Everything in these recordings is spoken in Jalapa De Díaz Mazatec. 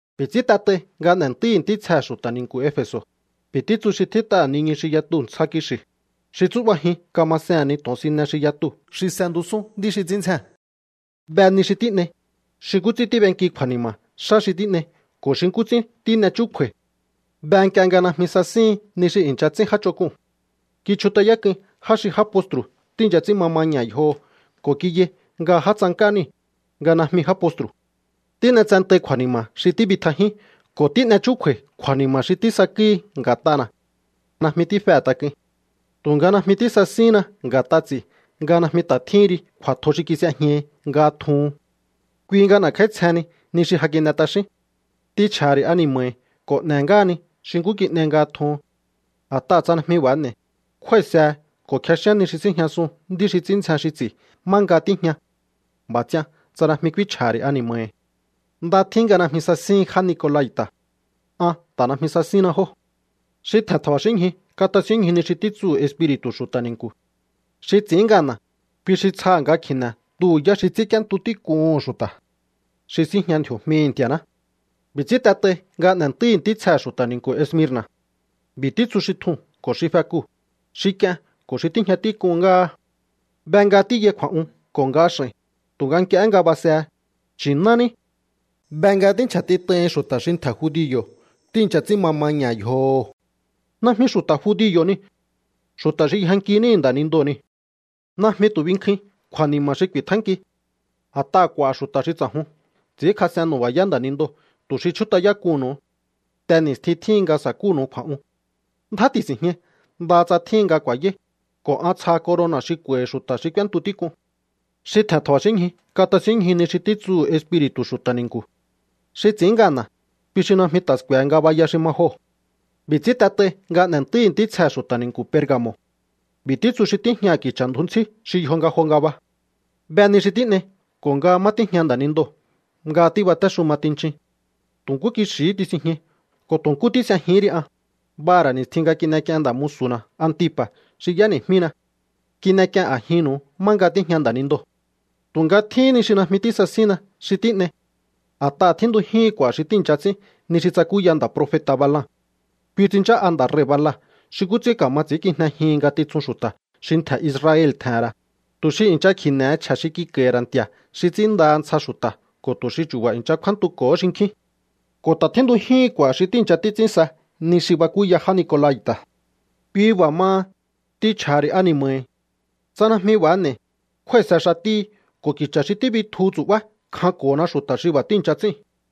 ’B'i̱ ts'ín t'et'ai nga n'e̱ntúíhi̱ ntítsjehe̱ xu̱ta̱ ni̱nku̱ Efe̱so̱: “B'i̱ títsu xi tjít'aha̱ niñu xi yatuu̱ ntsja kixi̱, xi tsú'bajin kamasehe̱n ni to̱onsine xi yatu xi s'entusún nd'í xi ts'ín ndzjee̱n: Be ni xi tín'ei, xi nkú ts'ín tíb'enki kju̱a̱ni̱ma̱ xá xi tín'ei ko̱ xi nkú ts'ín tín'e chúkju̱a̱i̱. Be nk'ie nga najmi sasíhin ni xi i̱ncha ts'ín já ch'onk'uu̱n. Kichjut'ayák'uin já xi já postru̱ tíi̱ncha ts'ín ma maña̱ yjoho̱ ko̱ kiyai nga já tsank'á niu̱, nga najmi já postru̱. Tín'etsentai kju̱a̱ni̱ma̱ xi tíbitjajín ko̱ tín'e chúkju̱a̱i̱ kju̱a̱ni̱ma̱ xi tísakúhi nga̱t'ana̱. Najmi tífehe̱ tak'uin. ’Tu̱nga najmi tísasíhínna nga̱t'a ts'i̱ nga najmi ta̱ tjíhin ri kju̱a̱tjo xi kis'ejñahi nga tjuhun. Kui nga n'e̱kj'áítsjehenni ni xi ja kin'e t'axín. T'inchj'a̱ha̱ ri̱ ani̱ma̱hi̱ ko̱ n'e̱ ngáhani xi nkú kin'ei nga tjuhun. A̱t'aha̱ tsa najmi b'a̱ n'e̱i̱, kjúái̱sehe ko̱ kjexíán ni xi síjñasun nd'í xi ts'ín ndzjen xi ts'i̱ má nga tíjña. B'a̱ ts'ian tsa najmi k'úínchj'aha̱ ri̱ ani̱ma̱hi̱. ’Nda tjín nga najmi sasíhin já nicolai̱ta̱. An ta̱ najmi sasínna jóo̱. ’¡Xi tje̱n tja̱ba̱xíñju katasínñju ni xi títsuhu̱ Espiri̱tu̱ xu̱ta̱ ni̱nku̱! Xi ts'i̱ín ngana̱, kui xi tsjaha̱ nga kji̱ne̱ tuhu̱ yá xi ts'ínk'íéntu tík'uhu̱n xu̱ta̱, xi síjña ndji̱o̱jmihi̱ Nti̱a̱ná.” ’B'i̱ ts'ín t'et'ai nga n'e̱ntúíhi̱ ntítsjehe̱ xu̱ta̱ ni̱nku̱ Esmirna̱: “B'i̱ títsu xi tjuu̱n ko̱ xi fekuu̱, xi k'ien ko̱ xi tíjña tík'un ngáha: Be nga tíyai kju̱a̱'un ko̱ nga x'a̱i̱n, tu̱nga nk'ie nga basehe, nchi̱ná ní. Be nga tínchja̱tit'aihin xu̱ta̱ xi ntje̱ judio̱ tíi̱ncha ts'ín ma maña̱ yjoho̱. Najmi xu̱ta̱ judio̱ niu̱. Xu̱ta̱ xi yjanki níhi̱ nda̱nindoo̱ niu̱. Najmi tu̱ binkjuin kju̱a̱ni̱ma̱ xi ku̱i̱tjánki. A̱t'aha̱ k'u̱a̱ xu̱ta̱ xi ts'a̱jun ts'i̱ínkjas'en nu̱ba̱yá nda̱nindoo̱ tu̱ xi chjút'ayák'uhu̱nnu̱u. Te ni̱stjin tjíhin nga sa̱kúnu̱u kju̱a̱'un. Ndjá ti̱si̱njñai ndaha tsa tjíhin nga ku̱a̱yáí, ko̱ an tsjaha corona̱ xi k'u̱a̱i̱hi̱ xu̱ta̱ xi k'úéntu tík'uu̱n. ’¡Xi tje̱n tja̱ba̱xínñju katasínñju ni xi títsuhu̱ Espiri̱tu̱ xu̱ta̱ ni̱nku̱! Xi ts'i̱ín ngana̱, kui xi najmi ta̱ sku̱e̱he ngabaya xi ma joo̱.” ’B'i̱ ts'ín t'et'ai nga n'e̱ntúíhi̱ ntítsjehe̱ xu̱ta̱ ni̱nku̱ Perga̱mo̱: “B'i̱ títsu xi tíjñaha̱ ki̱cha̱ ndju ntsí xi yjo nga jo ngaba: Be ni xi tín'ei ko̱ nga má tíjña nda̱nindoo̱ nga tíbatéxuma tinchin. Tu̱ nkú kixi̱hí tisinjñai ko̱ tu̱ nkú tís'ejihín ri an, b'aha̱ ra̱ ni̱stjin nga kin'ek'ien nda̱ musu̱na̱ Antipa̱ xi y'éni̱jmína. Kin'ek'ien a̱jinnu̱u má nga tíjña nda̱nindoo̱. ’Tu̱nga tjíhín ni xi najmi tísasínna xi tín'ei. A̱t'aha̱ tjíntujíhin k'u̱a̱ xi tíi̱ncha ts'ín ni xi tsakúya nda̱ profeta̱ Balaam. Kui tsinchá'a nda̱ rei̱ Balac xi nkú ts'ín ka̱ma ts'i̱ínkijnejihin ngatitsun xu̱ta̱ xi ntje̱ Israel tje̱he̱n ra̱, tu̱ xi i̱ncha kji̱ne̱he chje̱ xi kik'a̱i̱hi̱ ra̱ nti̱a̱ xi ts'ínndaha ntsja xu̱ta̱ ko̱ tu̱ xi chu̱ba̱ i̱ncha kjúántuko̱ho xinkjín. Ko̱ ta̱ tjíntujíhin k'u̱a̱ xi tíi̱ncha títs'ín sa ni xi bakúya já nicolai̱ta̱. Kui b'a̱ maha, t'inchj'a̱ha̱ ri̱ ani̱ma̱hi̱. Tsa najmi b'a̱ n'e̱i̱, kjúái̱se xatíhi ko̱ ki̱cha̱ xi tíbitjuhu tsu̱'bá kjanko̱hona xu̱ta̱ xi b'a̱ tíi̱ncha ts'íu̱n.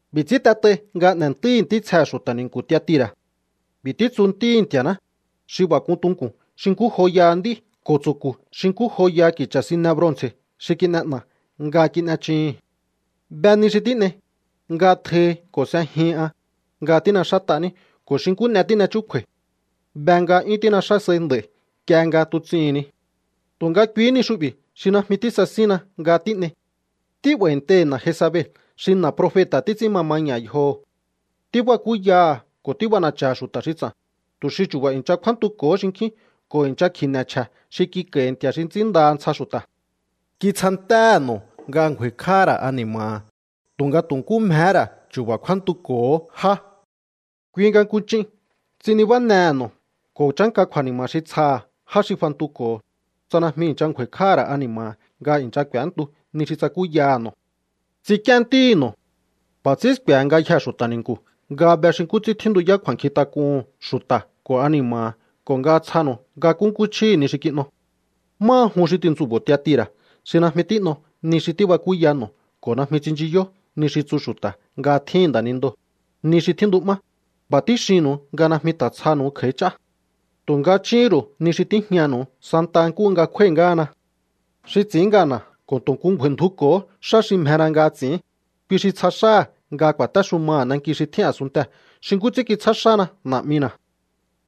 ’B'i̱ ts'ín t'et'ai nga n'e̱ntúíhi̱ ntítsjehe̱ xu̱ta̱ ni̱nku̱ Tiatira̱: “B'i̱ títsu Ntíhi̱ Nti̱a̱ná, xi b'a̱ k'un tunku̱n xi nkú joyaha nd'í ko̱ tsu̱ku̱ xi nkú joyaha ki̱cha̱ sine bronce̱ xi kin'e'na̱ nga kin'echuhu̱n: Be ni xi tín'ei, nga tjohi ko̱ s'ejihin an, nga tín'exát'aní ko̱ xi nkú n'e tín'e chúkju̱a̱i̱. Be nga 'yún tín'exá sai nd'a̱i̱ nk'ie nga tuts'ihi̱n ni. ’Tu̱nga kuihí ni xu'bi̱ xi najmi tísasínna nga tín'ei. Tí'ba̱i̱nteihi̱ na̱ Jezabel xi na̱ profeta̱ títs'ín ma maña̱ yjoho̱. Tíbakúyaha̱ ko̱ tíb'ana̱cha̱ha̱ xu̱ta̱ xi ts'a̱n, tu̱ xi chu̱ba̱ i̱ncha kjúántuko̱hó xinkjín ko̱ i̱ncha kji̱ne̱ chje̱ xi kik'a̱i̱hi̱ nti̱a̱ xi ts'ínndaha ntsja xu̱ta̱. Kitsjantéhe̱ no̱ nga ngju̱a̱i̱kj'áha̱ ra̱ ani̱ma̱ha̱ tunga tu̱ nkú mjehé ra̱ chu̱ba̱ kjúántuko̱hó já. Kui nga nku ch'in ts'in nibánehe̱ no̱ ko̱ chánka kju̱a̱ni̱ma̱ xi tsjaha̱ já xi fantuko̱ho̱, tsa najmi i̱ncha ngju̱a̱i̱kj'áha̱ ra̱ ani̱ma̱ha̱ nga i̱ncha k'u̱éntu ni xi tsakúyaha̱ no̱. Ts'ink'íén ntíhi̱ no̱. B'a̱ ts'ín sku̱e̱he ngayjee̱ xu̱ta̱ ni̱nku̱ nga be xi nkú ts'ín tjíntuyá kju̱a̱nkjintak'uhu̱n xu̱ta̱ ko̱ ani̱ma̱ha̱ ko̱ nga tsjanu̱u nga nkúnkú chjíhi̱ ni xi kin'o. ’Máha jun xi tintsu̱bo̱o Tiatira̱ xi najmi tín'o ni xi tíbakúya no̱ ko̱ najmi tsinchiyó ni xi tsu xu̱ta̱ nga tjíhi̱n nda̱nindoo̱, ni xi tjíntu'má, b'a̱ tíxinnu̱u nga najmi ta̱ tsjaha̱nu̱u kj'a̱í ch'á. Tu̱nga chúhún ru̱u ni xi tíjñanu̱u santa nkúhu nga kjúái̱ ngáhana. ’Xi ts'i̱ín ngana̱ ko̱ tu̱ nku ngju̱a̱i̱ndjuko̱hó xá xi mjena nga ts'i̱ín, kui xi tsja xáha̱ nga ku̱a̱téxumaha̱ nanki xi tjín a̱sunntee̱ xi nkú ts'ín kitsjá xána Na̱'mina̱.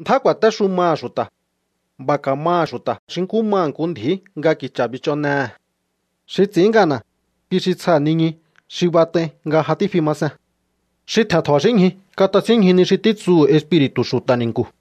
Ndjá ku̱a̱téxumaha̱ xu̱ta̱. B'a̱ ka̱maha̱ xu̱ta̱ xi nkú maha̱ nku ndji̱í nga ki̱cha̱ bich'onnehe̱. Xi ts'i̱ín ngana̱, kui xi tsjaha̱ niñu xi bat'ai nga ja tífi ma sen. ’¡Xi tje̱n tja̱ba̱xínñju katasínñju ni xi títsuhu̱ Espiri̱tu̱ xu̱ta̱ ni̱nku̱!”